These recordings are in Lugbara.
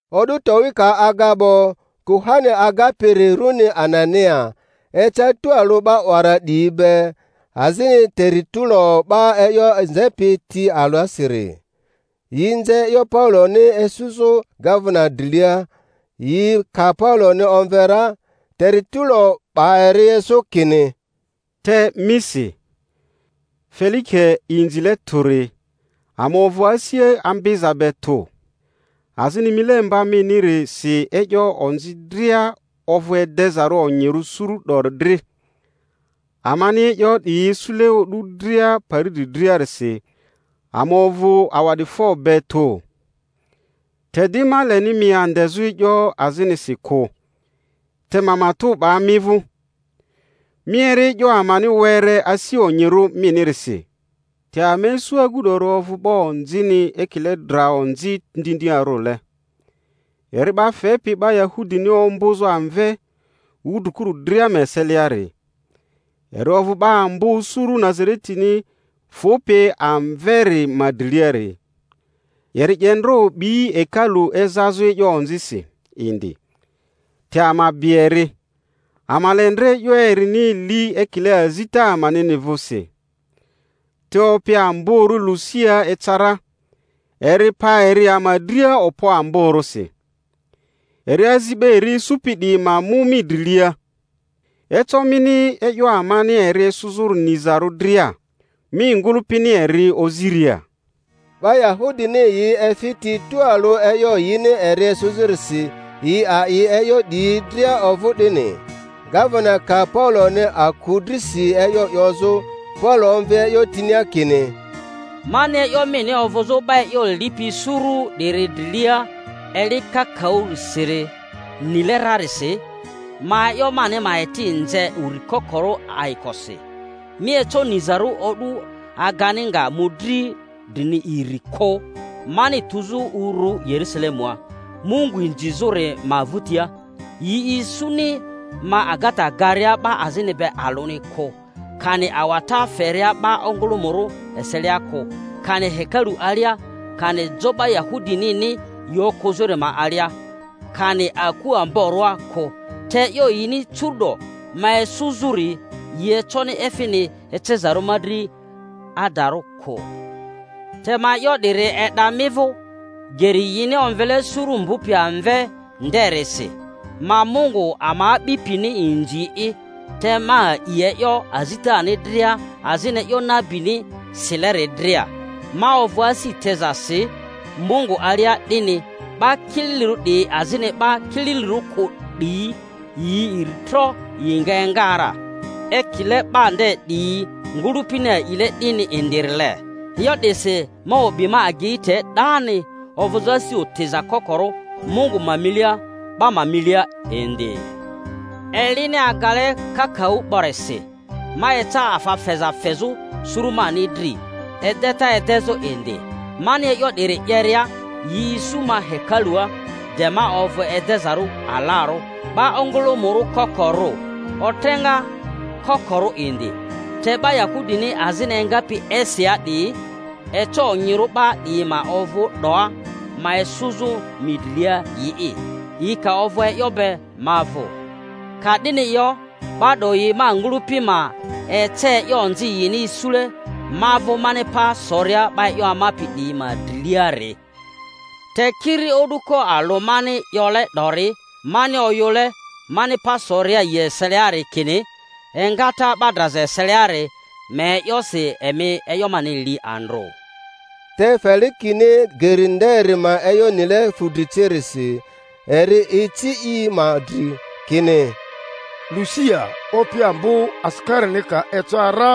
O'du towi ka aga 'bo, kuhani agapiri runi Anania, eca tualᴜ 'ba 'wara 'diyi be, azini Teritulo 'ba e'yo nzepi ti alasiri. Yi nze e'yo Pauloni esᴜzᴜ gavena drilia; yi ka Pauloni omve ra, Teritulo 'ba eri esᴜ kini: Te misi, Felike inzile tᴜri, ama ovᴜ asi ambiza be tᴜ, azini milemba minirisi e'yo onzi dria ovᴜ edezarᴜ onyirᴜ suru 'dori dri, amani e'yo 'diyi isule o'du dria pari dri driarisi, ama ovᴜ awa'clifo be tᴜ. Te di ma leni mi andezᴜ e'yo azinisi kᴜ, te ma matᴜ 'ba mi vᴜ, mi eri e'yo amani were asi onyirᴜ minirisi. Te ama isu agu 'dori ovᴜ 'ba onzini ekile dra onzi ndindiarᴜle, eri 'ba fepi 'ba Yahudini ombᴜzᴜ amve wudrikuru dria ma eseliari, eri ovᴜ 'ba ambo suru Nazaretini fᴜpi amveri ma driliari. Eri 'ye ndra o'bi hekalu ezazᴜ e'yo onzisi indi, te ama bi eri, ama le ndra e'yo erini li ekile azita amanini vᴜsi. Te opi amborᴜ Lusia eca ra, eri pa eri ama dria okpo amborᴜsi, eri azi 'ba eri esᴜpi 'diyi ma mu mi drilia. Eco mini e'yo amani eri esᴜzᴜri nizarᴜ dria, mi ngᴜlᴜpini eri oziria. 'Ba Yahudini yi efi ti tualᴜ e'yo yini eri esᴜzᴜrisi, yi a'i e'yo 'diyi dria ovᴜ 'dini. Gavena ka Pauloni aku drisi e'yo 'yozᴜ, Paulo omvi e'yo tinia kini: Mani e'yo mini ovᴜzᴜ 'ba e'yo lipi suru 'diri drilia eli kakaᴜsiri nile rarisi, ma e'yo mani ma eti nze uri kokorᴜ ayikosi. Mi eco nizarᴜ o'du agani nga mᴜdri drini iri kᴜ, mani tuzᴜ uru Yerusalemua Mungu inzizᴜri ma vᴜtia; yi isuni ma agata garia 'ba azini be alᴜni kᴜ, kani awata feria 'ba ongᴜlᴜmᴜrᴜ eselia kᴜ, kani hekalu alia, kani jo 'ba Yahudinini yi okᴜzᴜri ma alia, kani aku amborᴜa kᴜ. Te e'yo yini curu'do ma esᴜzᴜri yi econi efini ecezarᴜ mi dri adarᴜ kᴜ. Te ma e'yo 'diri e'da mi vᴜ, Geri yini omvele suru mbᴜpi amve nderisi, ma Mungu ama a'bipini inzi'i, te ma a'i e'yo azitani dria azini e'yo nabini sileri dria; ma ovᴜ asi tezasi Mungu alia 'dini, 'ba kililirᴜ 'diyi azini 'ba kililirᴜ kᴜ 'diyi iri tro yi nga enga ra, ekile 'ba nde 'diyi ngᴜlᴜpini a'ile 'dini indirile. E'yo 'disi ma o'bi ma agei te 'dani, ovᴜzᴜ asi otiza kokorᴜ Mungu ma milia, 'ba ma milia indi. Elini agale kakaᴜ 'borisi, ma eca afa feza fezᴜ suru mani dri, edeta edezᴜ indi. Mani e'yo 'diri 'yeria, yi isu ma hekalua de ma ovᴜ edezarᴜ alarᴜ, 'ba ongᴜlᴜmᴜrᴜ kokorᴜ, otreŋa kokorᴜ indi. Te 'ba Yahudini azini engapi Asiaa 'diyi— eco onyirᴜ 'ba 'diyi ma ovᴜ 'doa ma esᴜzᴜ mi drilia yi'i, yi ka ovᴜ e'yo be ma vᴜ. Ka 'dini yo, 'ba 'doyi ma ngᴜlᴜpi ma ece e'yo onzi yini isule ma vᴜ mani pa soria 'ba e'yo amapi 'diyi ma driliari. Te kiri o'duko alᴜ mani 'yole 'dori, mani oyᴜle mani pa soria yi eseliari kini, Engata 'ba draza eseliari ma e'yosi emi e'yo mani li andrᴜ. Te Felikeni Geri nderi ma e'yo nile fudri cirisi, eri ici yi ma dri, kini, Lusia opi ambo asikarini ka eca ra..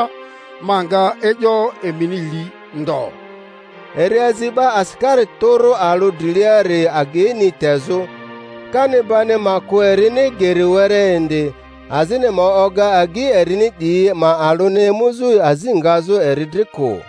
ma nga e'yo emini li ndo. Eri azi 'ba asikari tᴜrᴜ alᴜ driliari ageini tezᴜ, kani bani ma kᴜ erini geri were indi, azini ma oga agyi erini 'diyi ma alᴜni emuzᴜ azi ngazᴜ eri dri kᴜ.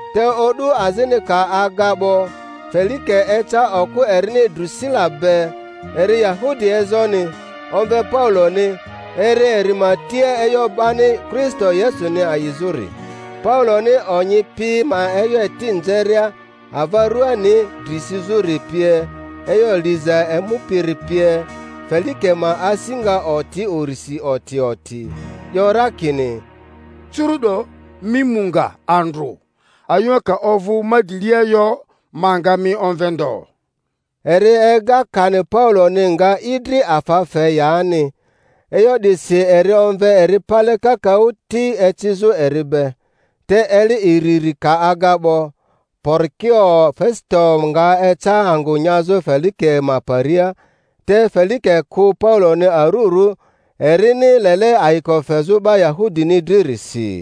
Te o'du azini ka aga 'bo, Felike eca okᴜ erini Drᴜsila be, eri Yahudi ezoni; omve Pauloni, eri eri ma tia e'yo 'bani Kristo Yesuni a'izᴜri. Pauloni onyi pi ma e'yo eti nzeria, ava ruani dri sizᴜri pie, e'yo liza emupiri pie, Felike ma asi nga oti urisi oti oti, 'yo ra kini: Curu'do mi mu nga andrᴜ; ayᴜŋa ka ovᴜ ma drilia yo, ma nga mi omve ndo. Eri ega kani Pauloni nga i dri afa fe yani. E'yo 'disi eri omve eri pale kakaᴜ ti ecizᴜ eri be. Te eli iriri ka aga 'bo, Porikio Fesito nga eca angᴜ nyazᴜ Felike ma paria; te Felike kᴜ Pauloni arurᴜ, erini lele ayiko fezᴜ 'ba Yahudini dririsi.